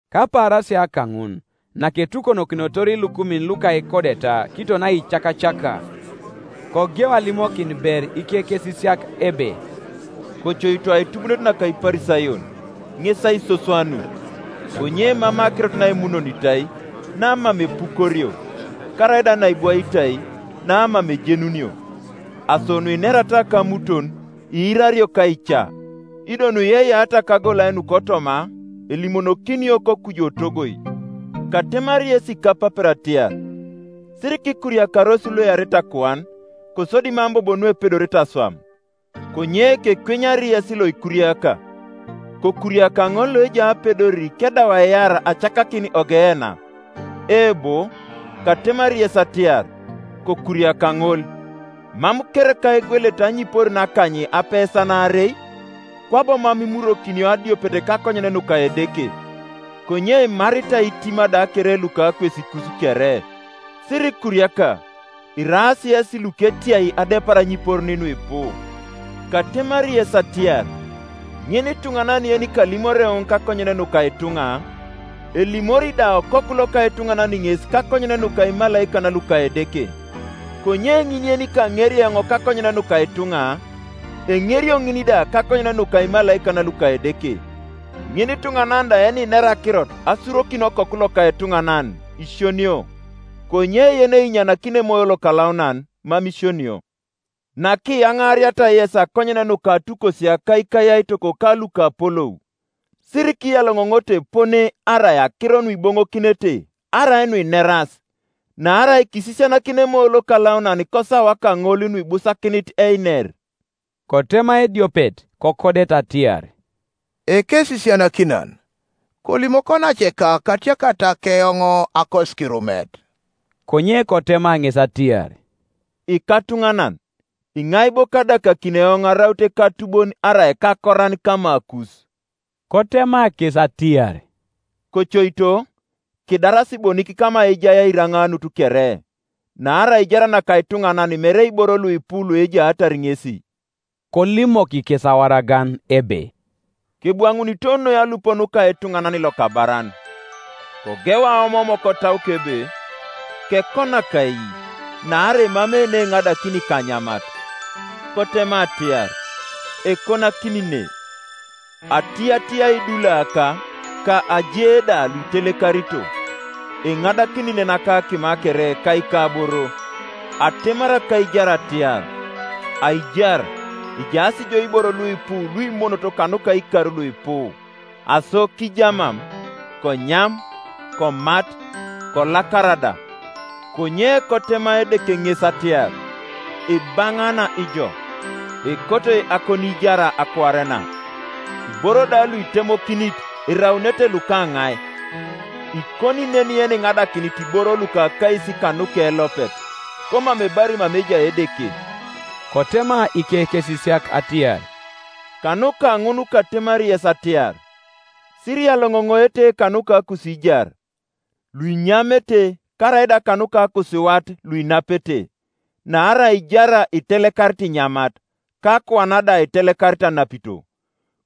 Kapaarasia kaŋun, naketukonokinotor ilukumin luka ikodeta kiton aicakacaka, kogeu alimokin ber ikekesisiak ebe, “Kocoito aitubuunet naka Iparisayon, ŋes aisoswanut. Konye emamei akirot naimunonitai, namam epukorio; karaida naibwaitai, namam ejenunio, Aso nuinerata kamuton iirario kaica; ido nuiyeiyeata kagolai nukotoma elimonokinio kokuju otogoi. “Katemari yes ikapapero atiar, Sirikikuriakaros luearete akuan, kosodi mam bobo nuepedorete aswam. Konye kekwenyari yes loikuriaka: kokuriaka ŋol loejai apedor kedau aiar acakakin Ogeena; eebo, katemari yes ariar, Kokuriaka ŋol. Mam kereka egwelete anyiporin akany apesan aarei? Kwabo mam imurwokinio adiopet kakonyen nuka Edeke. Konye imaritai itima da kere luka akwesikus kere, Sirikuriaka; iraas yesi luketiai adepar anyiporin nuipu. “Katemari yes atiar, ŋinituŋanan yenikalimori eoŋ kakonyen nuka ituŋa, elimori da Okoku loka etuŋanan ŋes kakonyen nuka imalaikan luka Edeke; Konye ŋin yenikaŋeri eoŋ kakonyen nuka ituŋa, enerio ŋin da kakonyen nuka imalaikan luka Edeke. Ŋinituŋanan da yeninera akirot asurokin Okoku loka etuŋanan isionio; konye yeneinyanakini Emoyo Lokalaunan mam isionio. Nakiyaŋaariata yes akonyen nuka atukosia ka ikayaitok ka lukapolou, sirikiyaloŋoŋoto epone arai akiro nuiboŋokinete arai nuineras; naarai kisisianakini Emoyo Lokalaunan kosawa kaŋol nuibusakinit einer.” Kotema ediopet kokodet atiar, “Ekesisianakinan, kolimok onaceka katiakata keoŋ akosikirumet.” Konye kotema ŋes atiar, “Ikatunanan, iŋai bo kadakakini eoŋ araut ekatubon arai ekakoran kamakus?” Kotema kes atiar, “Kocoito, kidaras bonik kama ejai airaŋaanut kere; naarai aijar naka ituŋanan mere iboro luipu luejaatar ŋesi.” Kolimok kes awaragan ebe, “Kebwaŋunito noi alup nuka etuŋanan lokabaran. Kogeu aomoom kotauke ebe, ‘Kekonak ai, naarai emamei neengadakini ikanyamat?’ Kotema atiar, ‘Ekonakini ne; atiyatiyai idulaaka, ka aje da luitelekarito; eŋadakini nen akakima kere ka ikaboro.’ Atemari akaijar atiar, ‘Aijar, ejaas jo iboro luipu luimonot kanuka ikar luipu; aso kijamam, konyam, komat, kolakara da.’ Konye kotema Edeke ŋes atiar, ‘Ibaŋaana ijo! Ekotoi akoniijar akuare na; iboro da luitemokinit, eraunete lukaŋai?’ Ikoni nen yeniŋadakinit iboro luka akais kanuke elopet, komam ebari mama ejai Edeke.” Kotema ikekesisiak atiar, “Kanuka ŋun katemari yes atiar, Siriyaloŋoŋoete kanuka akusiijar, luinyamete, karaida kanuka akusiwat luinapete, Naarai aijar itelekarit inyamat, ka akuan da itelekarit anapito.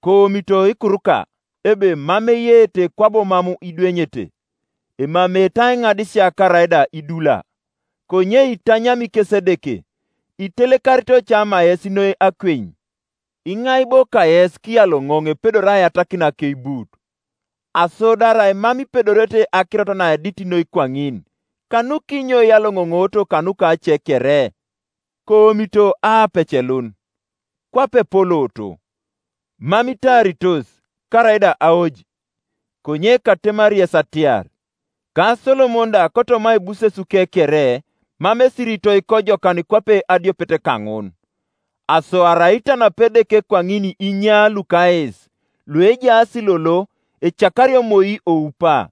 Koomito ikuruka ebe mam eyeete kwabo mam idwenyete, emameete aiŋadisia karaida idulaa; konye itanyami kes Edeke, Itelekarito cama yesi noi akweny! Iŋai bo kayes kiyaloŋoŋ epedori aiyatakin akeibut? Aso do arai mam ipedorete akirot naedit noi kwaŋin, kanukinyo iyaloŋonooro kanuka ace kere? Koomito aapecelun, kwape epolooto; mam itaaritos, karaida aoj; konye katemari yes atiar. Ka Solomon da kotoma aibusesuke kere mam esiritoi kojokan kwape adiopet kaŋun. Aso arai itanapi Edeke kwaŋin inya luka ais, Iuejaas lolo, ecakario moi oupa;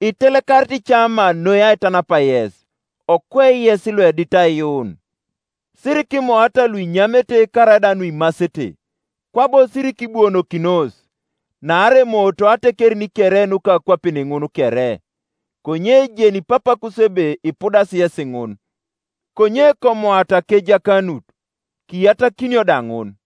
itelekarit cama noi aitanap yes, okwe yes luedit aiyuun. Sirikimoata luinyamete karaida nuimasete, kwabo sirikibuonokinos. Naarai emooto atekerin kere nuka akwapin ŋun kere: konye ejeni Papakus ebe ipudasi yesi ŋun. Konye komoata akejakanut, kiyatakinio da ŋun.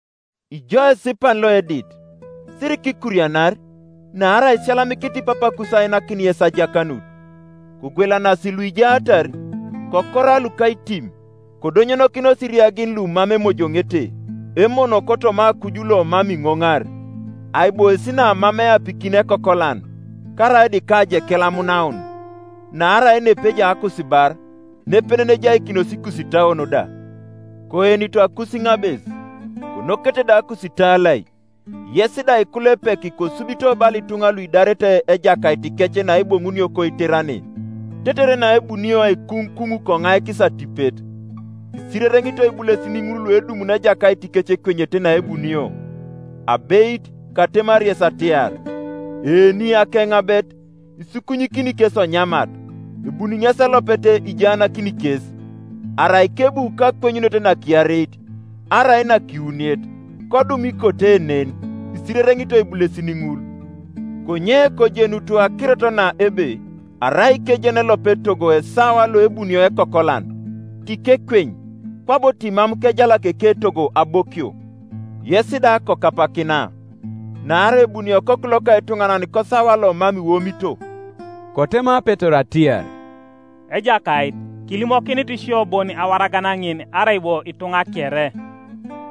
“Ijo esipan loedit, sirikikurianar, naarai isiyalamikinit Papakus ainakin yes ajakanut. Kogwelanasi luijaatar, kokora lukaitim; kodonyonokinos iriagin lumam emojoŋete, emono kotoma akuj lomam iŋoŋar, aibois namam eapikini ekokolan, karaida ikajekel amunaun. Naarai nepejai akusibar, nepenen ejaikinos ikusitauon da. “Koenito akusiŋabes, konokete da akusitalai; yes da ikulepek kosubito bala ituŋa luidarete ejakaitikec naeboŋunio koiterane tetere naebunio aikuŋukuŋ koŋaikis atipet. Isirereŋitoi ibulesin ŋul luedumuni ejakaitikec ekwenyete naebunio; abeit, katemari yes atiar, eeni akeŋabet, isukunyikini kes onyamat, ebuni ŋesi elopet ijaanakini kes. Arai kebu kakwenyunet nakiareit, arai nakiwuniet, kodum ikote nen, isirereŋitoi ibulesin ŋul. Konye kojenutu akirot na ebe arai kejeni elopet etogo esawa loebunio ekokolan, tikekweny, kwabo timam kejalaki eketogo abokio. Yes da kokapakina; naarai ebuni Okoku loka etuŋanan kosawa lomam iwomito.” Kotema Petero atiar, “Ejakait, kilimokinit sio bon awaragan ŋin, arai bo ituŋa kere?”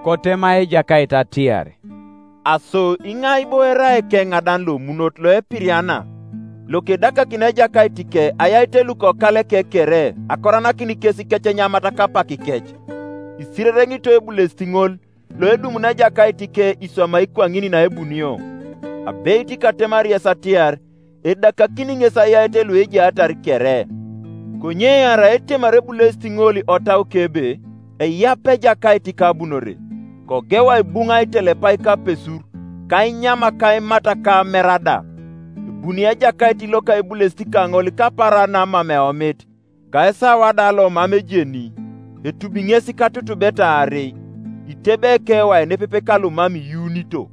Kotema Ejakait atiar, “Aso iŋai bo erai ekeŋadan lomunot loepiriana, lokedakakini ejakaitike ayait lukokaleke kere akoranakin kes ikecenyamat kapakikec? Isirereŋitoi ebulesit ŋol, loedumuni ejakaitike iswamai kwaŋin naebunio. Abeit katemari yes atiar, Edakakini ŋes ayait luejaatar kere. Konye arai etemari ebulesit ŋol otauke ebe, ‘Eyap ejakaitika abunore,’ kogeu aibuŋ itelepai ka apesur, ka ainyam ka aimat ka amer da; ebuni ejakait loka ebulesit kaŋol kapaaran namam eomit, ka esawa da lomam ejeni, etubi ŋes katutubeta aarei, itebei ekewai nepepe kalumam iyuunito.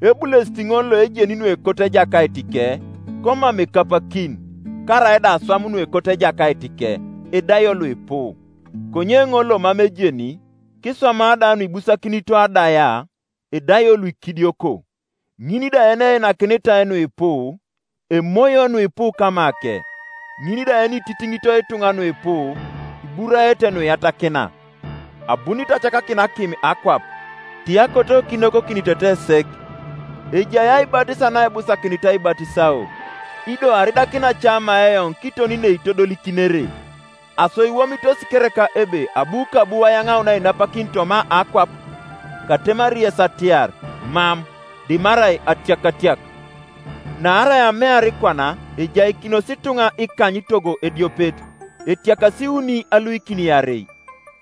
Ebulesit ŋol loejeni nuekoto ejakaitike, komam ekapakin, karaida aswam nuekoto ejakaitike, edaio luipu. Konye ŋol lomam ejeni, kiswama da nuibusakinito adaia, edaio luikidioko. Ŋin da yeneinakinitai nuipu, emoio nuipu kamake; ŋin da yenititiŋito ituŋa nuipu, iburaete nuiyatakina. “Abunit acakakin akim akwap; ti akoto kinokokinitete sek! Ejai aibatis naebusakinit aibatisao; ido aridakina cama eoŋ kiton neitodolikinere! Aso iwomitos kereka ebe abu kabu ayaŋaun ainapakin toma akwap? Katemari yes atiar, Mam; dimarai atiakatiak: naarai amear kwana ejaikinos ituŋa ikany togo ediopet, etiakas iuni aluikin iarei,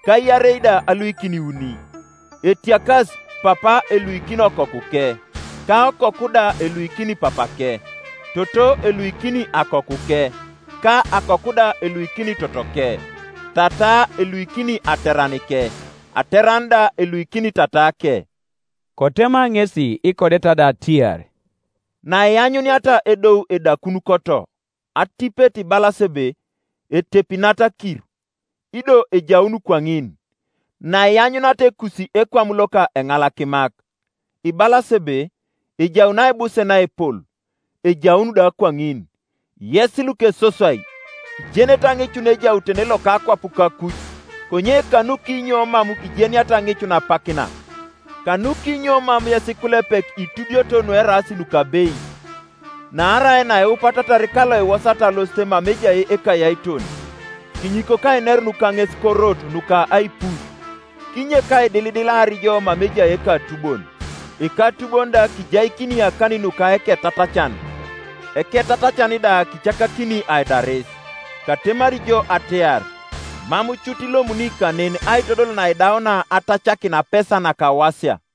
ka iarei da aluikin iuni; etiakas, papa eluikini okokuke, ka okoku da eluikini papake, toto eluikini akokuke, ka akoku da eluikini totoke, tataa eluikini ateranike, ateran da eluikini tataake.” Kotema ŋesi ikodeta da atiar, “Naianyuniata edou edakun koto, atipet ibalas ebe, ‘Etepi nat akir’; ido ejaun kwaŋin, Naianyuniata ekusi ekwam loka eŋalakimak, ibalas ebe, ‘Ejaun aibuse naepol’; ejaun da kwaŋin, Yes lukesoswai, ijenete aŋicun ejautene loka akwap ka akuj; konye kanukinyo mam ijeniata aŋicun apak na? “Kanukinyo mam yes ikulepek itubioto nueraas nukabeit? Naarai naiupatarar ka lokiwosat alosit mama ejai ekayaiton, kinyikok ainerun kaŋes korot nuka aipuc, kinyek aidilidilar jo mama ejai ekatubon, ekatubon da kijaikini akanin nuka eketatacan, eketatacan da kieakakini aidaris. Katemari jo atiar, Mam cut ilomuni kanen aitodol naidaunia atacakin apesa nakawasia.”